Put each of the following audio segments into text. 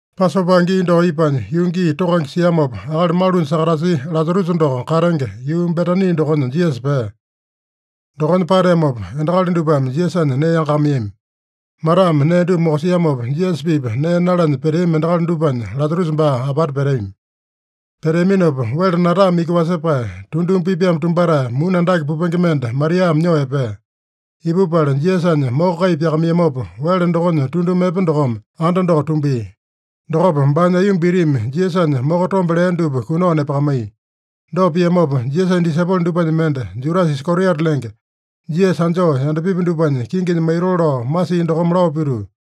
Pasopa gii doko ipanya, yuu gii tokange siamopa, akali malunya sakatasia Lasarusa doko katenge, yuu Betani dokonya Jisasa pea. Dokonya pateamopa endakali dupame Jisasanya nee yangakamaiyami. Matame nee dupa mokosiamopa, Jisasa-pipa nee nalanya peteami endakali dupanya Lasarusa baa apata peteami. Peteaminopa, wele natame iki wasepae, tunduma pipaeme tumbatae, muni andake pupenge mende Mariame nyoo epea. Ipupala Jisasanya moko kai pyakamaiyamopa, wele dokonya tunduma epe dokome anda doko tumbia. Dokopa baanya aiyomba itimi Jisasanya moko tombe lea dupa kunao nepakamaiya. Dopa piamopa, Jisasanya disaipolo dupanya mende, Judasa Iskariota lenge, Jisasa anjoo yandapipi dupanya kinginya maitoo lao masia dokome lao pituu,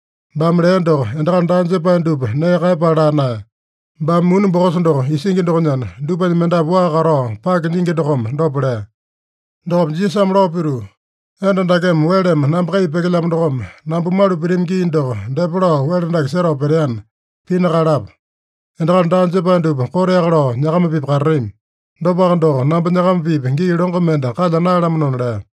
Baame lea doko, endakali daa jepae dupa nee kaeyapala laa naeya. Baame muni bokosa doko isingi dokonyana, dupanya mendapu waa katao pake nyingi dokome dopa lea. Dokopa Jisasame lao pituu, “Enda dakeme weleme namba kai pyekelyamo dokome, namba malu pitami gii doko depa lao wele dake setao peteana, pina kaeyalapa. Endakali daa jepae dupa koteaka lao nyakama-pipa katatami. Dopaka doko, namba nyakama-pipa gii longo mende kalya naeyalamanona” lea.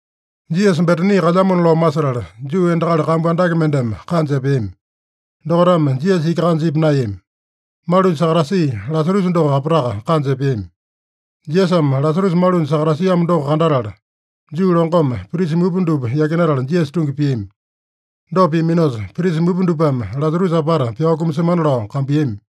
Jisasa Betani kalyamona lao masetala, Juu endakali kambu andake mendeme kanja epeami. Dokaitame Jisasa iki kanja ipa naeyami. Malunya sakatasia Lasarusa doko apataka kanja epeami. Jisasame Lasarusa malunya sakatasiamo doko kandatala, Juu longome prisa mupa dupa yakinatala Jisasa tungi piami. Dopa piaminosa, prisa mupa dupame Lasarusa apata pyao kumasemana lao kambuiyami.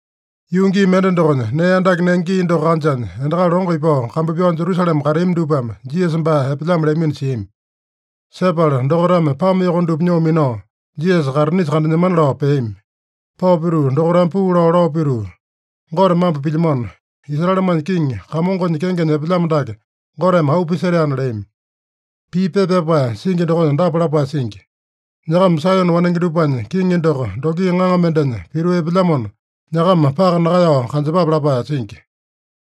Yuu gii mende dokonya, nee andake nenge gii doko kanjanya, endakali longo ipao kambu pyao Jerusalema kateami dupame Jisasa baa epelyamo leamino siami. Sepala dokaitame pame yoko dupa nyoo minao, Jisasa kaitinisa kandanyemana lao peami. Pao pituu dokaitame puu lao, lao pituu, “Gote mambo pilyamano! Israelemanya kiŋi, Kamongonya kengenya epelyamo dake Goteme auu pisetaena” leami. Pii pepa pyapae singi dokonya dapa lapae singi: “Nyakama Saeyone wanenge dupanya kiŋi doko dongi ŋaŋa mendenya pituu epelyamona, nyakama paka nakaeyao kanjepape” lapae singi.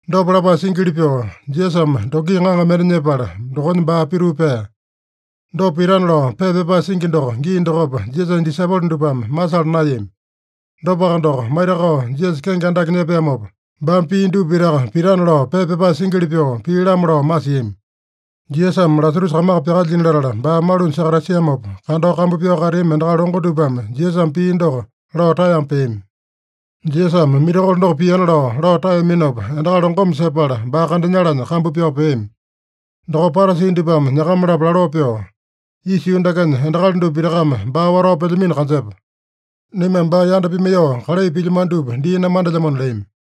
Dopa lapae singili pyoo, Jisasame dongi ŋaŋa mende nyepala, dokonya baa pituu pea. Dopa pitana lao pepa pyapae singi doko gii dokopa Jisasanya disaipolo dupame masala naeyami. Dopaka doko, maitakao Jisasa kenge andake nyepeamopa, baame pia dupa pitaka pitana lao pepa pyapae singili pyoo pia-lamo lao masiami. Jisasame Lasarusa kamaka pyakalyina latala, baa malunya sakatasiamopa kandao kambu pyao kateami endakali longo dupame Jisasame pia doko lao taeyama peami. Jisasame mirakolo doko piana lao, lao taeyaminopa, endakali longome sepala, baa kandanyalanya kambu pyao peami. Dokopa Parasi dupame nyakama-lapo laloo pyoo, “Isa yuu dakenya endakali dupa pitakame baa watao pelyamino kanjepa. Naimame baa yanda pimaiyoo kalai pilyamano dupa dii namandelyamona” leami.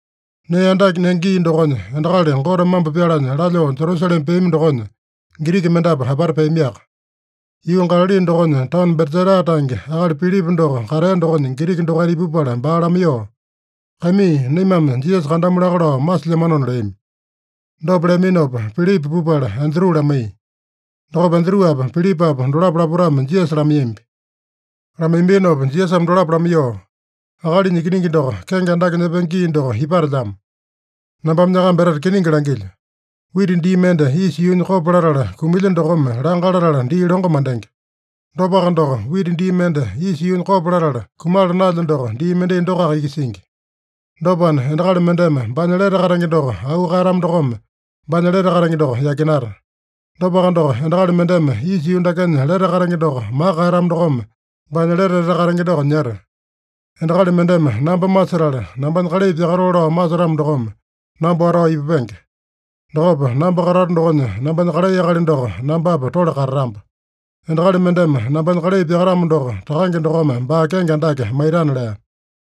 Nee andake nenge gii dokonya, endakali Gote mambo pyalanya lalyoo Jerusalema peami dokonya, Giriki mendapu apata peamiaka. Yuu Galali dokonya taono Betsaida tange akali Pilipa doko katea dokonya Giriki dokaita ipupala baa lamaiyoo, “Kaimii, naimame Jisasa kandamu laka lao masilyamanona” leami. Dopa leaminopa, Pilipa pupala Andru lamaiya. Dokopa Andruapa, Pilipapa dolapo lapotame Jisasa lamaiyambi. Lamaiyambinopa Jisasame dolapo lamaiyoo, “Akalinya Ikiningi doko kenge andake nyepenge gii doko ipatelyamo. Nambame nyakamba etete kiningi langilyo: Wita dii mende isa yuunya kopo latala kumilya dokome langa latala dii longo mandenge. Dopaka doko, wita dii mende isa yuunya kopo latala kumala naelya doko dii mendai dokoaka iki singi. Dopana, endakali mendeme baanya lete katenge doko auu kaeyatamo dokome, baanya lete katenge doko yakinata. Dopaka doko, endakali mendeme isa yuu dakenya lete katenge doko maka kaeyatamo dokome, baanya lete etete katenge doko nyeta. Endakali mendeme namba masetala, nambanya kalai pyakatoo lao masetamo dokome namba watao ipupenge. Dokopa namba katato dokonya nambanya kalai akali doko nambapa tole katatamba. Endakali mendeme nambanya kalai pyakatamo doko, Takange dokome baa kenge andake maitana” lea.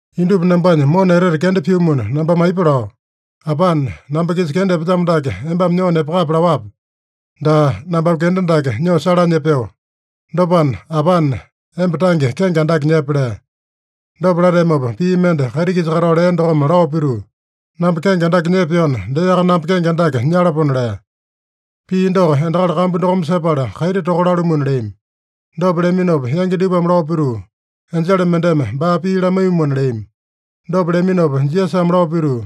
“Indupa nambanya mona etete kenda pyumuna, nambame aipa lao? ‘Apane, namba-kisa kenda epelyamo dake embame nyoo nepakape’ laowape? Daa, nambame kenda dake nyoo salanya epeo. Dopana, Apane, emba tange kenge andake nyepe” lea. Dopa lateamopa pii mende kaiti-kisa katao lea dokome lao pituu, “Namba kenge andake nyepeona, deaka namba kenge andake nyalapona” lea. Pii doko endakali kambu dokome sepala, kaiti toka lalumuna leami. Dopa leaminopa yangi dupame lao pituu, “Enjele mendeme baa pii lamaiyumuna” leami. Dopa leaminopa Jisasame lao pituu,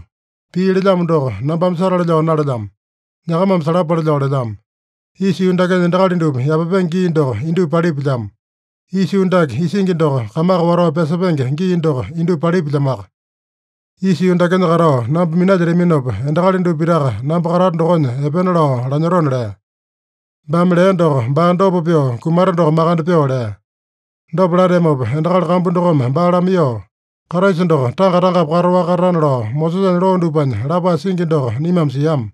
“Pii lelyamo doko, nambame satale lao nalelyamo. Nyakamame salapale lao lelyamo. Isa yuu dakenya endakali dupa yapapenge gii doko indupa palipilyamo. Isa yuu dake isingi doko kamaka watao pyasepenge gii doko indupa palipilyamoaka. Isa yuu dakenya katao namba minalyetaminopa, endakali dupa pitaka namba katato dokonya epena lao lanyotona” lea. (Baame lea doko, baa dopa pyoo kumata doko makande pyoo lea.) Dopa lateamopa endakali kambu dokome baa lamaiyoo, “Kraisa doko tanga-tangapi kataowaka katatana lao Mosesanya loo dupanya lapae singi doko naimame siama.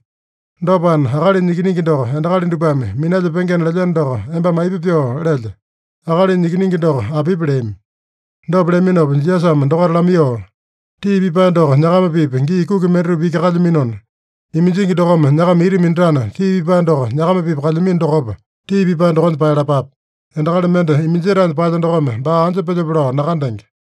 Dopana, ‘Akalinya Ikiningi doko endakali dupame minalyepengena’ lelyeno doko embame aipa pyoo lelye? Akalinya Ikiningi doko apipi?” leami. Dopa leaminopa Jisasame dokaita lamaiyoo, “Tii pipae doko nyakama-pipa gii kuki mendatupa iki kalyaminona, iminjingi dokome nyakama ita minatana, tii pipae doko nyakama-pipa kalyamino dokopa, tii pipae dokonya paeyalapape. Endakali mende iminjetaenya paelya dokome, baa anja pelyope lao nakandenge.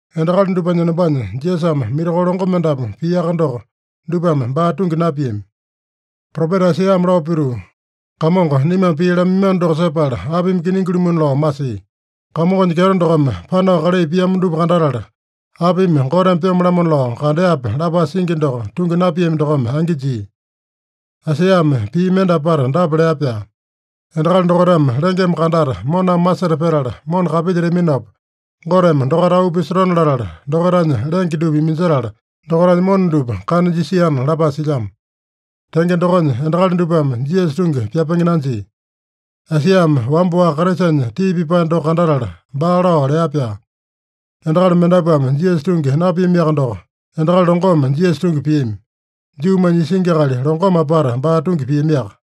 Endakali dupanya enombanya Jisasame mirakolo longo mendapu piaka doko, dupame baa tungi napiami. Propeta Aisaiyame lao pituu, “Kamongo, naimame pii lamaiyamano doko sepala apimi kiningi-lumuna lao masia? Kamongonya kyeto dokome panao kalai piamo dupa kandatala, apimi Goteme pyome-lamo lao kandeape?” lapae singi doko tungi napiami dokome angi jia. Aisaiyame pii mende apata dapa lea-pyaa: “Endakali dokaitame lengeme kandata, moname maseta petala, mona kapilyetaminopa, Goteme dokaita auu pisotone-latala, dokaitanya lenge dupa iminjetala, dokaitanya mona dupa kana jisiana” lapae silyamo. Tenge dokonya, endakali dupame Jisasa tungi pyapenge nanjia. Aisaiyame wamba-waka Kraisanya tii pipae doko kandatala, baa lao lea-pyaa. Endakali mendapuame Jisasa tungi napiamiaka doko, endakali longome Jisasa tungi piami. Juumanya isingi akali longome apata baa tungi piamiaka.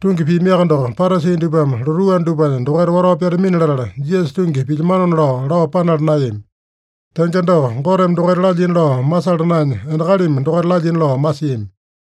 Tungi piamiaka doko, Parasi dupame lotuu anda dupanya dokaita watao pyatamini-latala, Jisasa tungi pilyamanona lao, lao panala naeyami. Tenge doko, Goteme dokaita lalyina lao masala naenya, endakalimi dokaita lalyina lao masiami.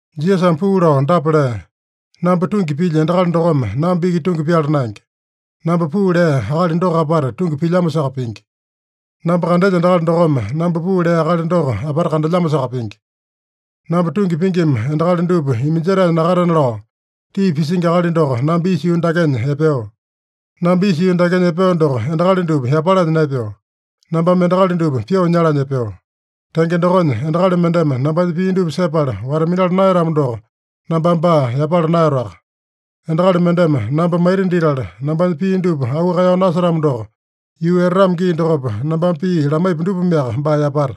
Jisasame puu lao dapa lea: “Namba tungi pilya endakali dokome namba iki tungi pyala naenge. Namba puu lea Akali doko apata tungi pilyamosaka pingi. Namba kandelya endakali dokome, namba puu lea Akali doko apata kandelyamosaka pingi. Namba tungi pingima endakali dupa iminjetaenya nakatena lao, tii pisingi akali doko namba isa yuu dakenya epeo. Namba isa yuu dakenya epeo doko, endakali dupa yapalanya naepeo. Nambame endakali dupa pyoo nyalanya epeo. Tenge dokonya, endakali mendeme nambanya pii dupa sepala wata-minala naeyatamo doko, nambame baa yapala naeyatoaka. Endakali mendeme namba maita ditala, nambanya pii dupa auu kaeyao nasetamo doko, yuu etatamo gii dokopa, nambame pii lamaipu dupameaka baa yapata.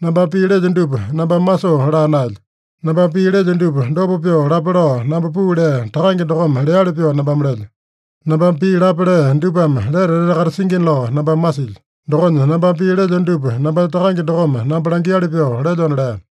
Nambame pii lelyo dupa nambame masoo laa naelyo. Nambame pii lelyo dupa dopa pyoo lape lao namba puu lea Takange dokome leali pyoo nambame lelyo. Nambame pii lape lea dupame lete etete katasingina lao nambame masilyo. Dokonya nambame pii lelyo dupa nambanya Takange dokome namba langiali pyoo lelyona” lea.